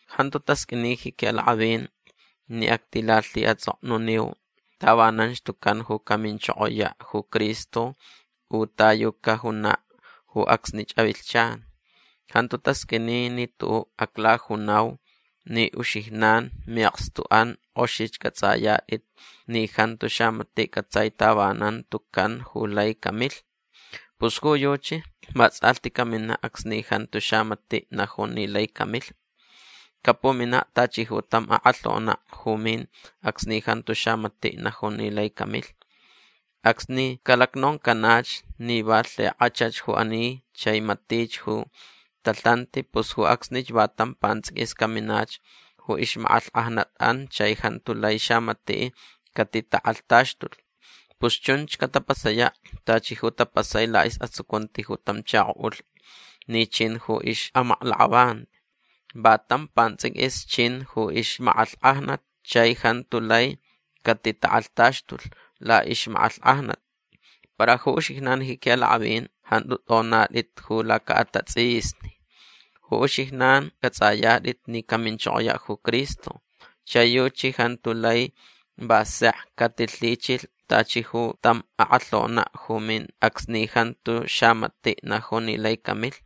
Jantu tasqʼuini ji quiʼalakʼavin ni actilalhiʼatsʼoknuniu tavananch tucan ju caminchokoyaʼ ju Cristo u ta yu cajunaʼ ju acsnich avilhchan. Jantu tasqʼuini ni tuʼuʼ aclajunau ni uxijnan miʼakstuʼan kʼoxich cʼatsʼayatʼit ni jantu xamatiʼ cʼatsai tavanan tucan ju lai camilh. Pus ju yuchi vatsʼalhti caminaʼ acsni jantu xamatiʼ najun ni lai camilh. Capuminaʼ tachi ju tam akʼalhonaʼ ju min acsni jantu xamatiʼ najun ni lai camilh. Acsni calacnoncanach ni va lhikʼachach ju ani chai matich ju talhanti pus ju acsnich va tam pantsʼiquis caminach ju ixmakʼalhkʼajnatʼan chai jantu lai xamatiʼ catitakʼalhtaxtulh. Pus chunch catapasayaʼ tachi ju tapasai laʼisʼatsucunti ju tam chakoʼulh ni chin ju ixʼamaklakʼavanti. Va tam pantsʼiquis chin ju ixmakʼalhkʼajnat chai jantu lai catitakʼalhtaxtulh laʼixmakʼalhkʼajnat. Para ju uxijnan ji quiʼalakʼavin jantu tʼonatʼit ju lacaʼatatsʼisni. Ju uxijnan cʼatsʼayatʼit ni caminchokoyaʼ ju Cristo. Chai yuchi jantu lai va sek catilhichilh tachi ju tam akʼalhonaʼ ju min acsni jantu xamatiʼ najun ni lai camilh.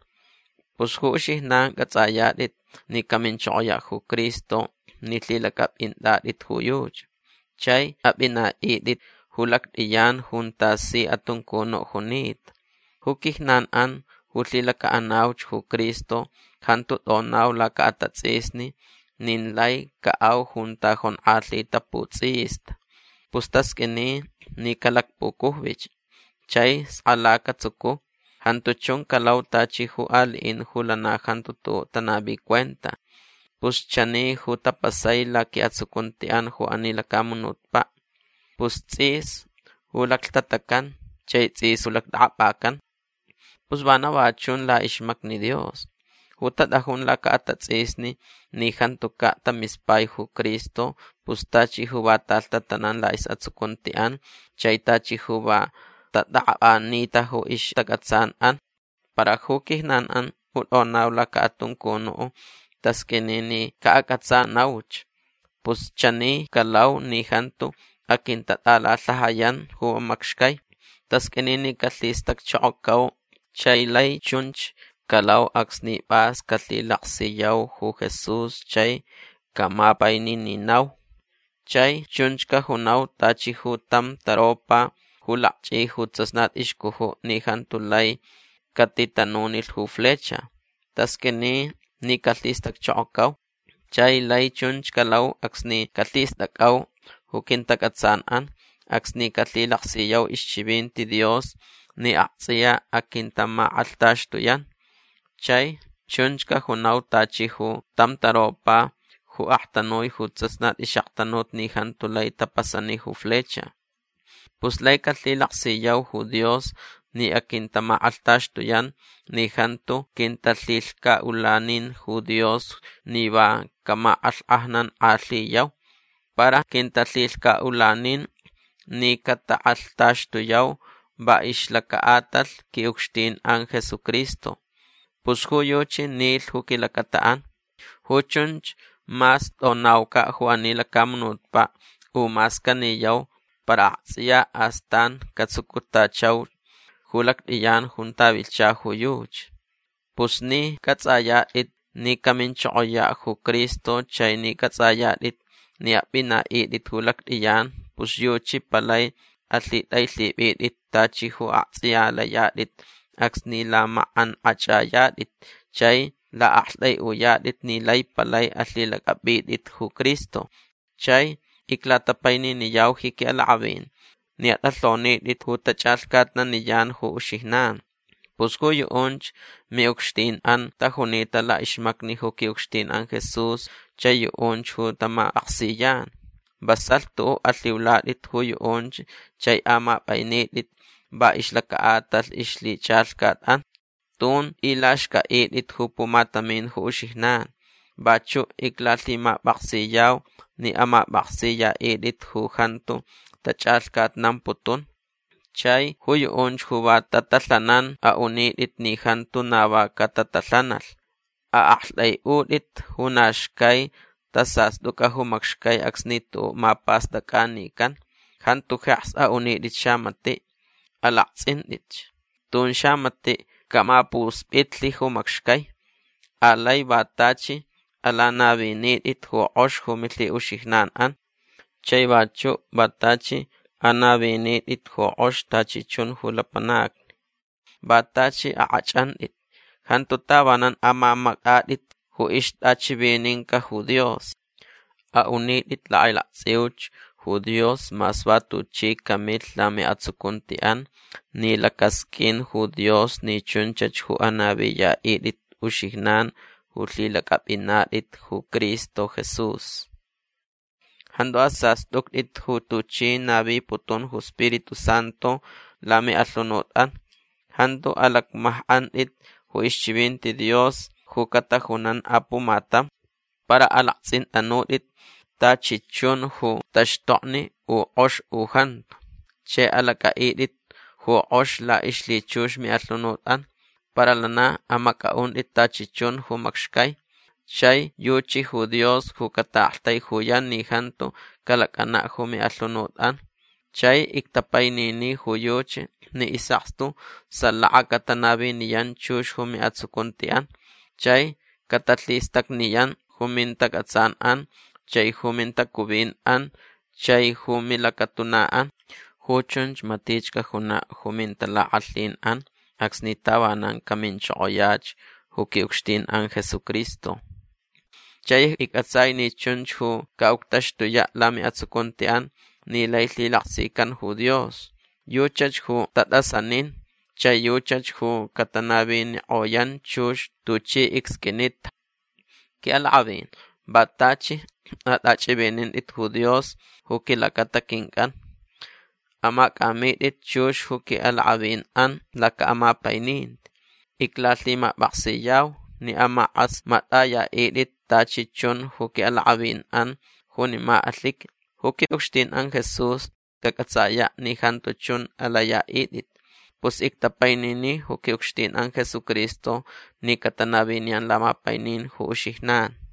Pus ju uxijnan cʼatsʼayatʼit ni caminchokoyaʼ ju Cristo ni lhilacʼapʼintʼatʼit ju yuchi. Chai apʼinaʼitʼit ju lactʼiyan junta si atuncunuʼ junita. Ju quijnanʼan ju lhilacaʼanauch ju Cristo jantu tʼonau lacaʼatatsʼisni nin lai caʼau junta jonkʼalhita putsʼista. Pus tasqʼuini ni calacpucujvich. Chai skala catsucu. Jantu chun calau tachi ju aliʼin ju lana jantu tuʼuʼ tanavi cuenta. Pus chani ju tapasai laquiʼatsucuntiʼan ju ani lacamunutpaʼ. Pus tsʼis ju laclhtatacan chai tsʼis ju lactʼakʼapʼacan. Pus vana va chun laʼixmacni Dios. Ju tatʼajun lacaʼatatsʼisni ni jantucaʼ tamispai ju Cristo pus tachi ju va talhtatanan laʼisʼatsucuntiʼan chai tachi ju va tatʼakʼapʼanita ju ixtacʼatsanʼan. Para ju quijnanʼan ju tʼonau lacaʼatuncunuʼ tasqʼuini ni caʼacʼatsanauch. Pus chani calau ni jantu aquintatʼalalhajayan ju macxcai. Tasqʼuini ni calhistacchokocau. Chai lai chunch calau acsni pʼas calhilaksiyau ju Jesús chai camapainininau. Chai chunch cajunau tachi ju tam taropa ju lakchʼi ju tsasnat ixcujuʼ ni jantu lai catitanunilh ju flecha. Tasqʼuini ni calhistacchokocau. Chai lai chunch calau acsni calhistʼacʼau ju quintacʼatsanʼan acsni calhilaksiyau ixchivinti Dios ni aktsʼiya aquintamakʼalhtaxtuyan. Chai chunch cajunau tachi ju tam taropa ju aktanui ju tsasnat ixʼaktanut ni jantu lai tapasani ju flecha. Pus lai calhilaksiyau ju Dios ni aquintamakʼalhtaxtuyan ni jantu quintalhilhcaʼulanin ju Dios ni va camakʼalhkʼajnankʼalhiyau. Para quintalhilhcaʼulanin ni catakʼalhtaxtuyau va ixlacaʼatalh quiʼucxtinʼan Jesucristo. Pus ju yuchi nilh ju quilacataʼan. Ju chunch mas tʼonaucaʼ ju ani lacamunutpaʼ u mas caniyau para aktsʼiya astan catsucutachauch ju lactʼiyan junta vilhcha ju yuchi. Pus ni cʼatsʼayatʼit ni caminchokoyaʼ ju Cristo chai ni cʼatsʼayatʼit ni apʼinaʼitʼit ju lactʼiyan pus yuchi palai alhitʼailhipʼitʼit tachi ju aktsʼiya layatʼit acsni lamakʼankʼachʼayatʼit chai laʼaktʼaiʼuyatʼit ni lai palai alhilacʼapʼitʼit ju Cristo. Chai iclatapaininiyau ji quiʼalakʼavin ni atʼalhonitʼit ju tachʼalhcatnaniyan ju uxijnan. Pus ju yuʼunch miʼucxtinʼan tajunita laʼixmacni ju quiʼucxtinʼan Jesús chai yuʼunch ju tamapʼaksiyan. Vasalh tuʼuʼ alhiulatʼit ju yuʼunch chai amapʼainitʼit va ixlacaʼatalh ixlhichʼalhcatʼan. Tun tʼilaxcʼaʼitʼit ju pumatamin ju uxijnan. Vachuʼ iclalhimapʼaksiyau ni amapʼaksiyaʼitʼit ju jantu tachʼalhcatnamputun. Chai ju yuʼunch ju va tatalhanan aʼunitʼit ni jantu na va catatalhanalh. Aʼaktʼaiʼutʼit ju na xcai tasastʼucʼa ju macxcai acsni tuʼuʼ mapastʼacʼanican. Jantu jeks aʼunitʼit xamatiʼ. Alaktsʼintʼitch. Tun xamatiʼ camapuspʼitlh ju macxcai. Alai va tachi alanavinitʼit ju kʼox ju milhiʼuxijnanʼan. Chai vachuʼ va tachi anavinitʼit ju kʼox tachi chun ju lapanacni. Va tachi akʼachʼantʼit. Jantu tavanan amamactʼatʼit ju ixtʼachivininca ju Dios. Aʼunitʼit lakʼailaktsʼiuch ju Dios mas va tuchi camilh lamiʼatsucuntiʼan ni lacasqʼuin ju Dios ni chunchach ju anaviyaʼitʼit uxijnan ju lhilacʼapʼinatʼit ju Cristo Jesús. Jantu asastʼuctʼit ju tuchi naviputun ju Spiritu Santu lamiʼalhunutʼan. Jantu alacmajkʼantʼit ju ixchivinti Dios ju catajunan apumatam. Para alaktsʼintʼanutʼit tachi chun ju taxtokni u kʼox u jantu. Chai alacʼaʼitʼit ju kʼox laʼixlhichux miʼalhunutʼan. Para lana amacʼaʼuntʼit tachi chun ju macxcai. Chai yuchi ju Dios ju cataʼaktaijuyan ni jantu calacʼanaʼ ju miʼalhunutʼan. Chai ictapainini ju yuchi ni isʼakstu salaka catanaviniyan chux ju miʼatsucuntiʼan. Chai catalhistacniyan ju mintacʼatsanʼan chai ju mintacuvinʼan chai ju milacatunaʼan. Ju chunch matich cajunaʼ ju mintalakʼalhinʼan acsni tavanan caminchokoyach ju quiʼucxtinʼan Jesucristo. Chai iccʼatsai ni chunch ju caʼuctaxtuyaʼ lamiʼatsucuntiʼan ni lai lhilaksican ju Dios. Yuchach ju tatʼasanin chai yuchach ju catanavinikʼoyan chux tuchi icsqʼuinita. Quiʼalakʼavin va tachi atʼachʼivinintʼit ju Dios ju quilacata quincʼan. Amacʼamitʼit chux ju quiʼalakʼavinʼan lacaʼamapaininti. Iclalhimapʼaksiyau ni amakʼasmatʼayaʼitʼit tachi chun ju quiʼalakʼavinʼan junima alhiqui. Ju quiʼucxtinʼan Jesús cacʼatsayaʼ ni jantu chun alayaʼitʼit. Pus ictapainini ju quiʼucxtinʼan Jesucristo ni catanaviniyan lamapainin ju uxijnan.